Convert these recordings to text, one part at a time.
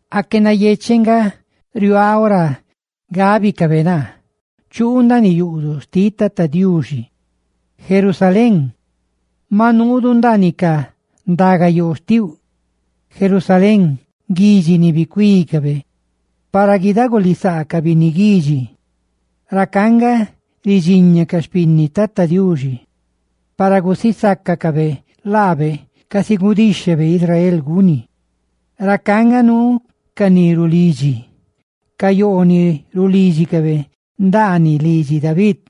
¡Aque nayecheꞌ nga riuaaꞌ ora gábicabe naa: «Chuu ndaaniꞌ yuꞌduꞌ xtiꞌ Tata Diuxi»! Jerusalén, ¡maꞌ nuudu ndaaniꞌ ca ndagayoo xtiuꞌ! Jerusalén, guidxi ni bicuícabe para guidagulisaa ca binni guidxi. Racá nga ridxiña ca xpinni Tata Diuxi para gusisácacabe lábe, casi nexheꞌ guni Israel. Racá nga nuu ca ni rulidxi, ca yoo roꞌ ra rulídxicabe ndaaniꞌ, lidxi David.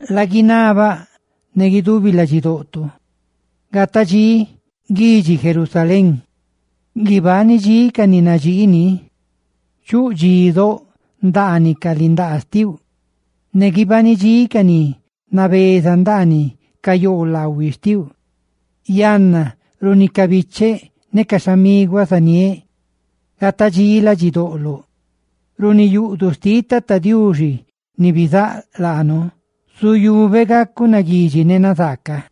Laguinabaꞌ ne guidubi ladxidoꞌto: «Gata dxí guidxi Jerusalén; guibani dxí ca ni nadxii lii. Chuꞌ dxí doꞌ ndaaniꞌ ca lindaa xtiuꞌ; ne guibani dxí ca ni nabeza ndaaniꞌ ca yoolaꞌhuiꞌ xtiuꞌ.» Yanna, runi ca bicheꞌ ne ca xhamiguaꞌ zaniéꞌ: «Gata dxí ladxidoꞌloꞌ Jerusalén. Runi yuꞌduꞌ xtiꞌ Tata Diuxi ni bizáꞌ laanu, zuyubeꞌ gacuꞌ naguidxi ne nazaaca.»